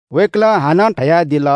वय्‌कलं हानं धयादिल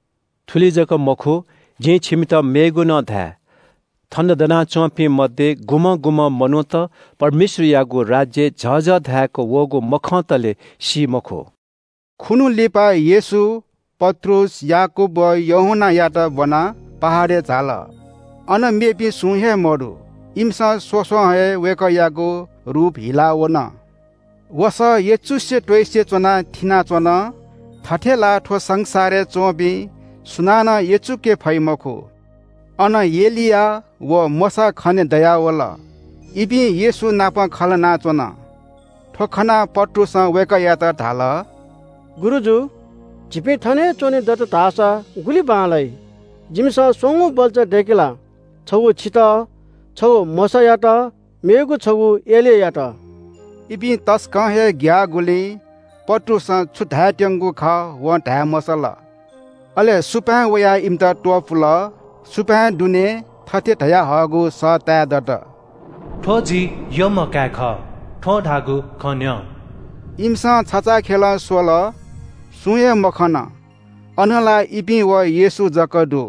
– “थुलि जक मखु, जिं छिमित मेगु नं धाये – थन दनाच्‍वंपिं मध्‍ये गुम्‍हं गुम्‍हं मनूत परमेश्‍वरयागु राज्‍य झःझः धाय्‌क वःगु मखंतले सी मखु।” खुन्‍हु लिपा येशू पत्रुस, याकूब व यूहन्‍नायात ब्‍वनाः पहाडय् झाल। अन मेपिं सुं हे मदु। इमिसं स्‍वस्‍वं हे वय्‌कःयागु रूप हिला वन। वसः यचुसे त्‍वइसे च्‍वनाः थिनाच्‍वन, थथे ला थ्‍व संसारय् च्‍वंपिं सुनानं यचुके फइ मखु। अन एलिया व मोशा खनेदयावल। इपिं येशू नाप खँ ल्‍हानाच्‍वन। थ्‍व खनाः पत्रुसं वय्‌कःयात धाल – “गुरुजु, झीपिं थन हे च्‍वने दत धाःसा गुलि बांलाइ। जिमिसं स्‍वंगू बल्‍चा दय्‌के ला। छगू छितः, छगू मोशायात व मेगु छगू एलियायात।” इपिं तसकं हे ग्‍याःगुलिं पत्रुसं छु धायेत्‍यंगु खः वं धाये मसल। अले सुपाँय् वयाः इमित त्‍वपुल। सुपाँय् दुनें थथे धयाहःगु सः ताये दत – “थ्‍व जि यःम्‍ह काय् खः। थ्‍वं धाःगु खँ न्‍यँ।” इमिसं छचाःखेलं स्‍वल, सुं हे मखन, अन ला इपिं व येशू जक दु।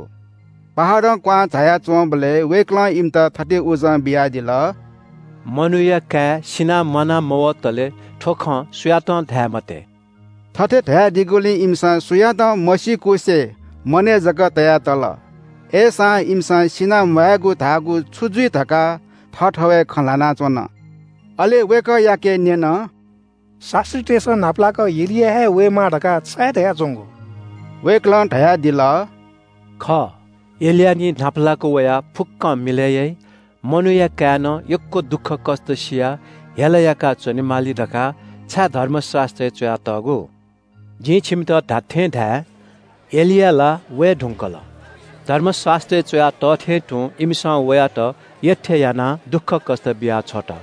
पहाडं क्‍वहां झाया च्‍वंबलय् वय्‌कलं इमित थथे उजं बियादिल – “मनूया काय् सिनाः म्‍वाना मवतलय् थ्‍व खँ सुयातं धाये मते।” थथे धयादीगुलिं इमिसं सुयातं मसीकुसे मनय् जक तया तल। अय्‌सां इमिसं सिनाः म्‍वायेगु धाःगु छु जुइ धकाः थःथवय् खँ ल्‍हानाच्‍वन। अले वय्‌कःयाके न्‍यन – “शास्‍त्रीतय्‌सं न्‍हापालाक एलिया हे वयेमाः धकाः छाय् धयाच्‍वंगु?” वय्‌कलं धयादिल – “खः, एलिया निं न्‍हापालाक वयाः फुक्‍कं मिलय् याइ। मनूया काय्‌नं यक्‍व दुःखकष्‍ट सियाः हेला याका च्‍वनेमाली धकाः छाय् धर्मशास्‍त्रय् च्‍वयातःगु? जिं छिमित धात्‍थें धाये – एलिया ला वये धुंकल। धर्मशास्‍त्रय् च्‍वया तः थें तुं इमिसं वयात यःथें यानाः दुःखकष्‍ट बियाछ्वत।”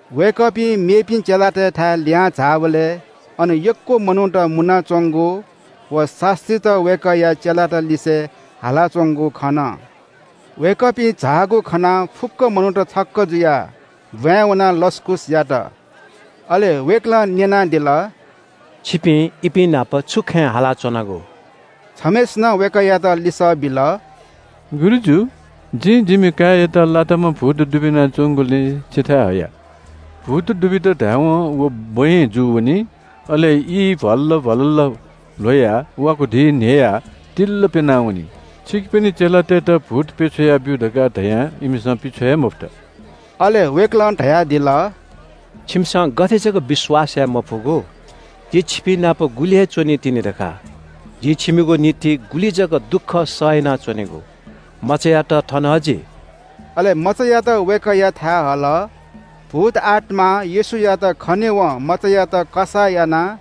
वय्‌कःपिं मेपिं चेलातय्‌थाय् लिहां झाःबलय् अन यक्‍व मनूत मुनाच्‍वंगु व शास्‍त्रीत वय्‌कःया चेलात लिसे हालाच्‍वंगु खन। वय्‌कःपिं झाःगु खनाः फुक्‍क मनूत छक्‍क जुयाः ब्‍वाँय् वनाः लसकुस यात। अले वय्‌कलं न्‍यनादिल – “छिपिं इपिं नाप छु खँय् हालाच्‍वनागु?” छम्‍हय्‌सिनं वय्‌कःयात लिसः बिल – “गुरुजु, जिं जिमि काय्‌यात लाताम्‍ह भूत दुबिना च्‍वंगुलिं छिथाय् हया। भूत दुबित धायेवं व बँय् जू वनी, अले ई भ्‍वाललल भ्‍वाललल ल्‍ह्वयाः वाकुधी न्‍ह्ययाः तिल्‍ल प्‍यना वनी। छिकपिनि चेलातय्‌त भूत पिछ्वया ब्‍यु धकाः धयां इमिसं पिछ्वये मफुत।” अले वय्‌कलं धयादिल – “छिमिसं गथे जक विश्‍वास याये मफुगु? जि छिपिंनाप गुलि हे च्‍वनीतिनि धकाः? जिं छिमिगु निंतिं गुलि जक दुःख सह यानाच्‍वनेगु? मचायात थन हजि।” अले मचायात वय्‌कःयाथाय् हल। भूतआत्‍मां येशूयात खनेवं मचायात कसाः यानाः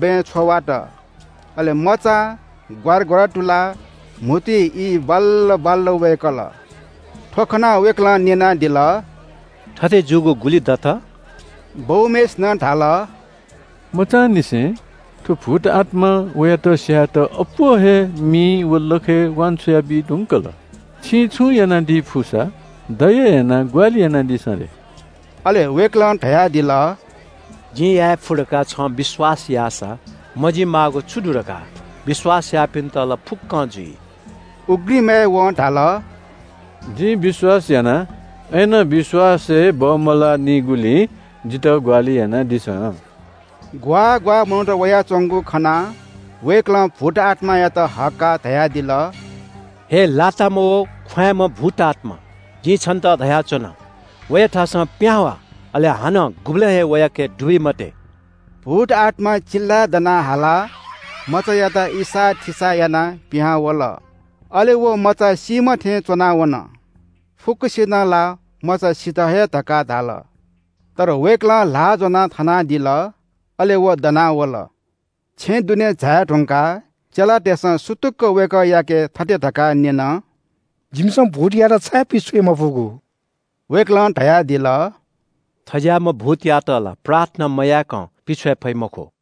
बँय् छ्वावात। अले मचां ग्‍वारा ग्‍वारा तुलाः म्‍हुतुइ ई भ्‍वाललल भ्‍वाललल वय्‌कल। थ्‍व खनाः वय्‌कलं न्‍यनादिल – “थथे जूगु गुलि दत?” बौम्‍हय्‌सिनं धाल – “मचांनिसें। थ्‍व भूतआत्‍मां वयात स्‍यायेत अप्‍वः हे मिइ व लखय् वान्‍छ्वया बी धुंकल। छिं छुं यानादी फुसा, दया यानाः ग्‍वाहालि यानादिसँ रे।” अले वय्‌कलं धयादिल – “जिं याये फु धकाः छं विश्‍वास याःसा मजी माःगु छु दु धकाः? विश्‍वास याःपिन्‍त ला फुक्‍कं जुइ।” उघ्रिमय् वं धाल – “जिं विश्‍वास याना, अय्‌नं विश्‍वासय् बमलाःनिगुलिं जितः ग्‍वाहालि यानादिसँ।” ग्‍वाः ग्‍वाः मनूत वयाच्‍वंगु खनाः वय्‌कलं भूतआत्‍मायात हक्‍काः धयादिल – “हे लाताम्‍ह व ख्‍वाँय्‌म्‍ह भूतआत्‍मा, जिं छन्‍त धयाच्‍वना – वयाथासं पिहां वा, अले हानं गुबलें हे वयाके दुबी मते।” भूतआत्‍मा चिल्‍लाय् दना हालाः मचायात इसाःथिसाः यानाः पिहां वल। अले व मचा सीम्‍ह थें च्‍वना वन। फुक्‍कसिनं ला मचा सित हे धकाः धाल। तर वय्‌कलं ल्‍हाः ज्‍वनाः थनादिल, अले व दना वल। छेँय् दुने झाये धुंकाः चेलातय्‌सं सुतुक्‍क वय्‌कःयाके थथे धकाः न्‍यन – “जिमिसं भूतयात छाय् पिछ्वये मफुगु?” वय्‌कलं धयादिल – “थज्‍याःम्‍ह भूतयात ला प्रार्थना मयाय्‌कं पिछ्वये फइ मखु।”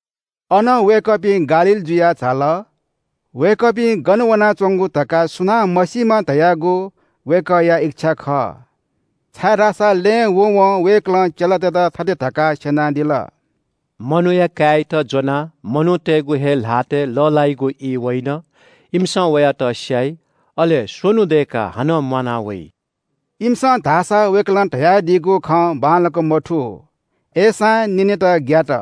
अनं वय्‌कःपिं गालील जुयाः झाल। वय्‌कःपिं गन वनाच्‍वंगु धकाः सुनां मसीमा धयागु वय्‌कःया इच्‍छा खः। छाय्‌धाःसा लँय् वँवं वय्‌कलं चेलातय्‌त थथे धकाः स्‍यनादिल – “मनूया काय्‌यात ज्‍वनाः मनूतय्‌गु हे ल्‍हातय् लः ल्‍हाइगु ई वइन। इमिसं वयात स्‍याइ, अले स्‍वन्‍हु दय्‌काः हानं म्‍वाना वइ।” इमिसं धाःसा वय्‌कलं धयादीगु खँ बांलाक मथू, अय्‌सां न्‍यनेत ग्‍यात।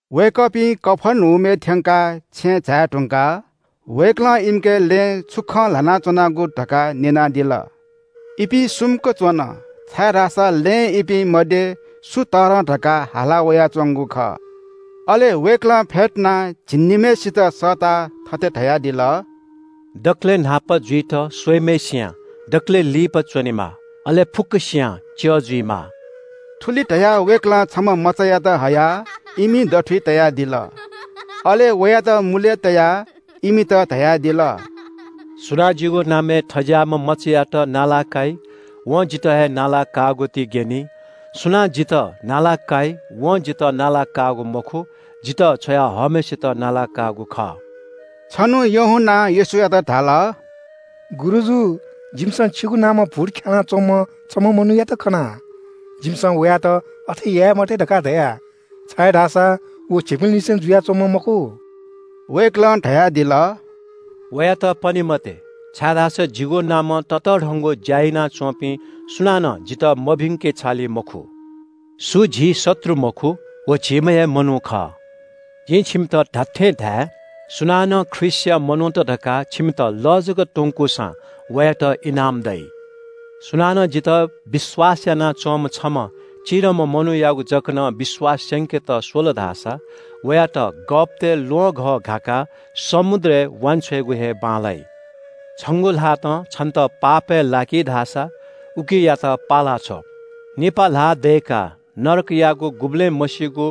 वय्‌कःपिं कफर्नहुमय् थ्‍यंकाः छेँय् झाये धुंकाः वय्‌कलं इमिके “लँय् छु खँ ल्‍हाना च्‍वनागु?” धकाः न्‍यनादिल। इपिं सुम्‍क च्‍वन, छाय्‌धाःसा लँय् इपिं मध्‍ये सु तःधं धकाः हाला वयाच्‍वंगु खः। अले वय्‌कलं फ्‍यतुनाः झिंनिम्‍हय्‌सितं सःताः थथे धयादिल – “दकलय् न्‍हापा जुइत स्‍वइम्‍हय्‌सियां दकलय् लिपा च्‍वनेमाः, अले फुक्‍कसियां च्‍यः जुइमाः।” थुलि धयाः वय्‌कलं छम्‍ह मचायात हयाः इमि दथुइ तयादिल। अले वयात मुलय् तयाः इमित धयादिल – “सुनां जिगु नामय् थज्‍याःम्‍ह मचायात लसकुस याइ, वं जितः हे लसकुस याःगुति ग्‍यनी। सुनां जितः लसकुस याइ वं जितः लसकुस याःगु मखु, जितः छ्वया हःम्‍हय्‌सित लसकुस याःगु खः।” छन्‍हु यूहन्‍नां येशूयात धाल – “गुरुजु, जिमिसं छिगु नामं भूत ख्‍यानाः च्‍वंम्‍ह छम्‍ह मनूयात खना। जिमिसं वयात अथे याये मते धकाः धया, छाय्‌धाःसा व झीपिंलिसे जुयाच्‍वंम्‍ह मखु।” वय्‌कलं धयादिल – “वयात पने मते, छाय्‌धाःसा जिगु नामं ततःधंगु ज्‍या यानाच्‍वंपिं सुनानं जितः मभिंके छालि मखु। सु झी शत्रु मखु, व झीम्‍ह हे मनू खः। जिं छिमित धात्‍थें धाये – सुनानं ख्रीष्‍टया मनूत धकाः छिमित लः जक त्‍वंकूसां वयात इनाम दइ।” “सुनानं जितः विश्‍वास यानाच्‍वंम्‍ह छम्‍ह चिधंम्‍ह मनूयागु जक नं विश्‍वास स्‍यंकेत स्‍वल धाःसा वयात गःपतय् ल्‍वहंघः घाकाः समुद्रय् वांछ्वयेगु हे बांलाइ। छंगु ल्‍हातं छन्‍त पापय् लाकी धाःसा उकियात पाला छ्व। निपा ल्‍हाः दय्‌काः नरकयागु गुबलें मसीगु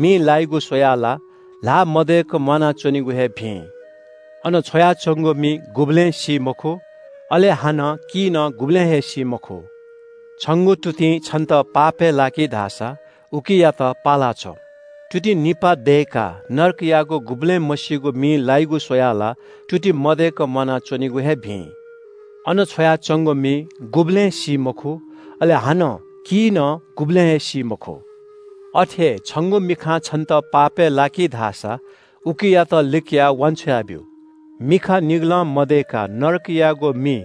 मिइ लाय्‌गु स्‍वयाः ला ल्‍हाः मदय्‌क म्‍वानाच्‍वनेगु हे भिं। अन छ्वयाच्‍वंगु मि गुबलें सी मखु, अले हानं की नं गुबलें हे सी मखु। छंगु तुतिं छन्‍त पापय् लाकी धाःसा उकियात पाला छ्व। तुति निपा दय्‌काः नरकयागु गुबलें मसीगु मिइ लायेगु स्‍वयाः ला तुति मदय्‌क म्‍वानाच्‍वनेगु हे भिं। अन छ्वयाच्‍वंगु मि गुबलें सी मखु, अले हानं की नं गुबलें हे सी मखु। अथे हे छंगु मिखां छन्‍त पापय् लाकी धाःसा उकियात लिकयाः वान्‍छ्वया ब्‍यु। मिखा निगलं मदयेका नरकयागु मिइ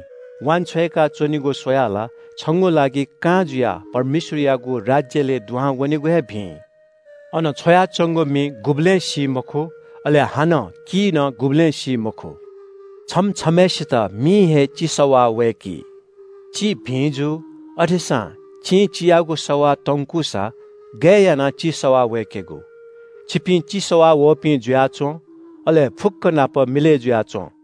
वांछ्वय्‌का च्‍वनेगु स्‍वयाः ला छंगु लागि कां जुयाः परमेश्‍वरयागु राज्‍यलय् दुहां वनेगु हे भिं। अन छ्वयाच्‍वंगु मि गुबलें सी मखु, अले हानं की नं गुबलें सी मखु। “छम्‍ह छम्‍हय्‌सित मिं हे चि सवाः वय्‌की। चि भिं जू, अथेसां चिं चियागु सवाः तंकूसा गय् यानाः चि सवाः वय्‌केगु? छिपिं चि सवाः वःपिं जुयाच्‍वँ, अले फुक्‍क नाप मिलय् जुयाच्‍वँ।”